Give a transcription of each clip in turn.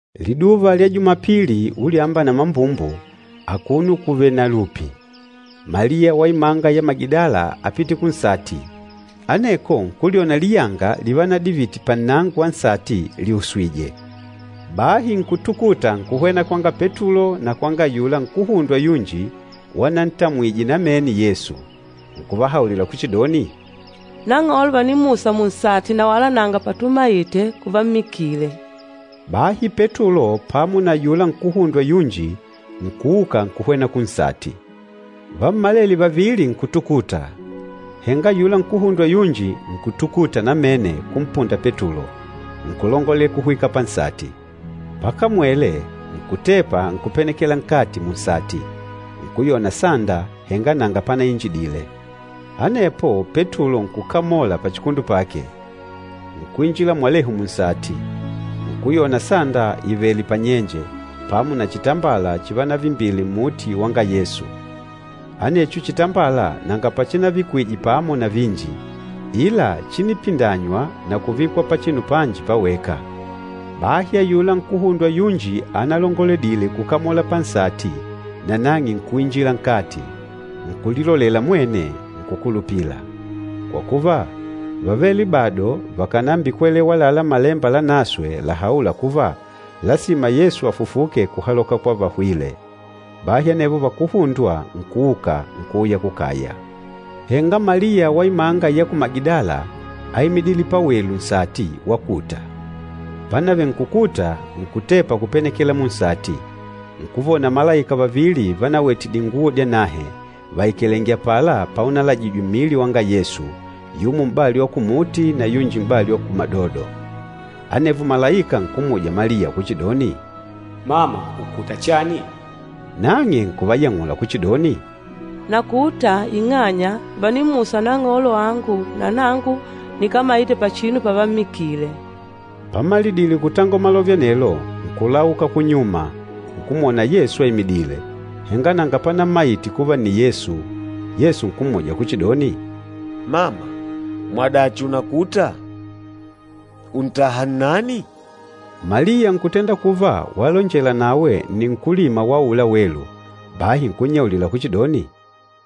Liduva lya Jumapili, ulyamba na mambumbu akuno kuvèlè na lupi, Maliya wa imanga ya Magidala ápite kunsati, aneko nkulyona liyanga livanadivite pannango wa nsati liuswije. Bahi nkutukuta nkuhwena kwanga Petulo na kwanga ayula nkuhundwa yunji wanantamwijwe namene na Yesu, nkuvahaulila kuchidoni, “Nang'olo vànimmusa munsati na wala nanga patumaite kuvammikile.” Bahi Petulo pamo na ayula nkuhundwa yunji nkuuka nkuhwena kunsati. Vammalele vavili nkutukuta, henga ayula nkuhundwa yunji nkutukuta namene kumpunda Petulo, nkulongolela kuhwika pansati. Pakamwele, nkutepa nkupenekela nkati munsati, nkuyona sanda, henga nanga panainjidile. Anepo Petulo nkukamola pachikundu pake, nkuinjila mwalehu munsati. Nkuyona sanda ìvele panyenje, pamo na chitambala chivanavimbile mmuti wanga Yesu. Anecho chitambala nanga pachinavikwije pamo na vinji, ila chínipindanywa na kuvikwa pachinu panji paweka. Bahi ayula nkuhundwa yunji analongoledile kukamola pansati nanang'e nkuinjila nkati. Nkulilolela mwene, nkukulupila. Kwa kuva, vávele bado vakànambikwelewa àlalá Malemba Lanaswe lahaûla kuva, lasima Yesu afufuke kuhaloka kwa vahwîle. Bahi anevo vakuhundwa nkuuka, nkuuya kukaya. Henga Maliya wa imanga ya ku Magidala áimidile pawelu nsati wakuta. Pánavele nkukuta, nkutepa kupenekela munsati, nkuvona malaika vavili vanawete dinguwo dyanahe, vaikalèngè apala paunalajijwe mmili wanga Yesu, yumo m'bali wa kumuti na yunji m'bali wa kumadodo. Anevo malaika nkummuja Maliya kuchidoni, “Mama, ùkuta chani?” Nang'e nkuvayang'ula kuchidoni, “Nakuta ing'anya vànimmusa Nang'olo wangu na nangu nikámaite pachinu pavammikile.” Pamalidile kutangola malove anelo, nkulauka kunyuma, nkumwona Yesu aimidìlè, henga nanga panammaite kuva nni Yesu. Yesu nkummuja kuchidoni, “Mama, mwadachi unakùtà? Ùntaha nnani?” Maliya nkutenda kuva walonjela nawe nni nkúlima wa aula welu, bahi nkunnyaulila kuchidoni,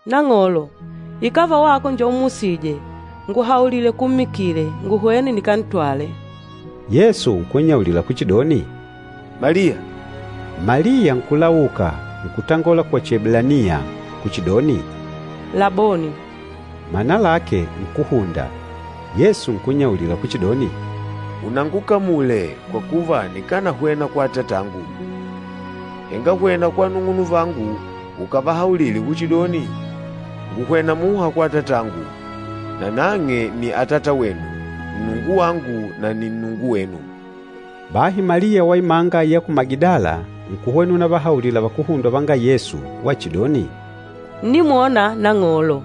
“Nang'olo, ikàva wako njo ummusîje, ngùhaulile kuummikile, nguhwene nikantwale.” Yesu nkunnyaulila kuchidoni, “Maliya!” Maliya nkulauka, nkutangola kwa Chieblaniya, kuchidoni, “Laboni!” Mana lake, Nkúhunda. Yesu nkunnyaulila kuchidoni, “Unangukamule, kwa kuva nikanahwena kwa Atatangu. Henga hwena kwa anung'unuvangu ukavahaulile kuchidoni, ‘Ngùhwena muha kwa Atatangu, nanang'e nni Atatawenu, Nnungu wangu na nni Nnungu wenu.’” Bahi Maliya wa imanga ya ku Magidala nkuhwena unavahaulila vakuhundwa vanga Yesu wachidoni, “Ǹnimwona Nang'olo!”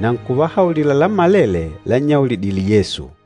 Na nkuvahaulila lammalele lannyaulidile Yesu.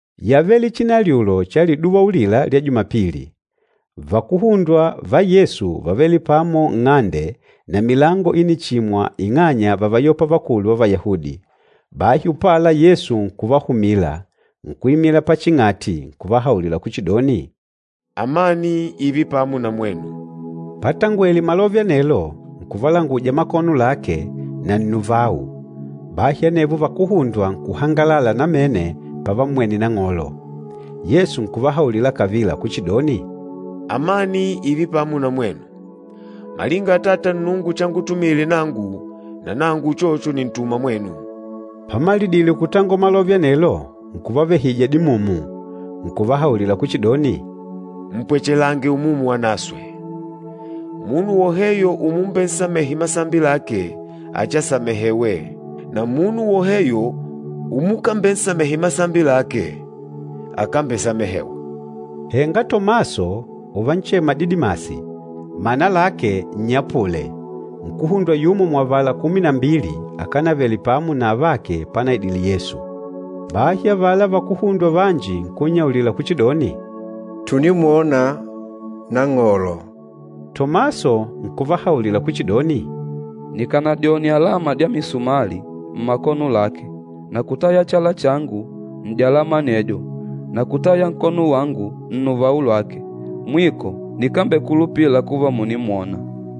Yávele chinalyulo cha liduva ulila lya Jumapili, vakuhundwa Yesu vávele pamo nng'ande na milango ínichimwa ing'anya vávayopa vakulu va Vayahudi. Bahi upala Yesu nkuvahumila, nkuimila paching'ati, nkuvahaulila kuchidoni, “Amani ììve pamo na mwenu!” Patangwele malove anelo, nkuvalanguja makono lake na nnuvau. Bahi anevo vakuhundwa nkuhangalala namene pavammwene Nang'olo. Yesu nkuvahaulila kavila kuchidoni, “Amani ììve pamo na mwenu! Malinga Atata Nnungu changutumile nangu, nanangu uchocho nìntuma mwenu.” Pamalidile kutangola malove anelo, nkuvavehija dimumu, nkuvahaulila kuchidoni, “Mpwechelange Umumu Wanaswe. Munu woheyo umumbensamehe masambi lake, achiasamehewe, na munu woheyo umukambensamehe masambi lake, akambesamehewa.” Henga Tomaso, uvanchema Didimasi, mana lake nnyapule, nkuhundwa yumo muavala kumi na mbili, akánavele pamo na avake panaidile Yesu. Bahi avala vakuhundwa vanji nkunnyaulila kuchidoni, “Tùnimwona Nang'olo.” Tomaso nkuvahaulila kuchidoni, “Nikànadyone alama dya misumali mmakono lake na kutaya chala changu n'dyalama anedyo na kutaya nkono wangu nnuvau lwake, mwiko nikambekulupila kuva mùnimwona.”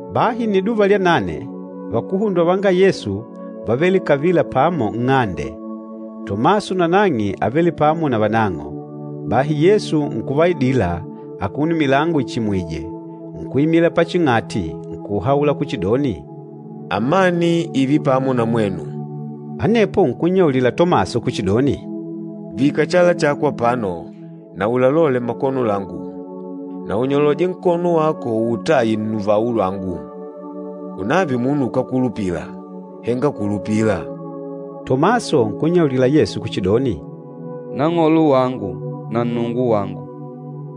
Bahi nniduva lya nane, vakuhundwa vanga Yesu vávele kavila pamo nng'ande, Tomaso nanang'e ávele pamo na vanang'o. Bahi Yesu nkuvaidila, akuno milango ichimìjwè, nkuimila paching'ati, nkuhaula kuchidoni, “Amani ììve pamo na mwenu!” Anepo nkunnyaulila Tomaso kuchidoni, “Vika chala chako apano, na ulalole makono langu, na unyoloje nkono wako uutaye nnuvau lwangu. Unave umunu ukákulupila, henga kulupila.” Tomaso nkunnyaulila Yesu kuchidoni, “Nang'olo wangu na Nnungu wangu.”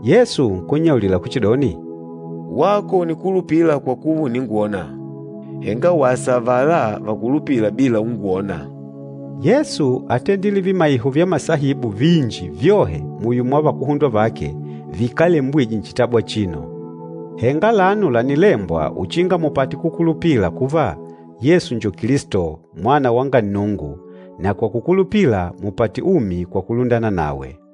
Yesu nkunnyaulila kuchidoni, “Wako ùnikulupila kwa kuva ùningwona, henga wasa avala vakulupîla bila ungwona.” Yesu átendile vimaiho vya masaibu vinji vyohe muyo mwa vakuhundwa vake vikálembwijwe nchitabu chino. Henga alano lànilembwa uchinga mupate kukulupila kuva Yesu njo Kilisto, Mwana wanga Nnungu, na kwa kukulupila mupate umi kwa kulundana nawe.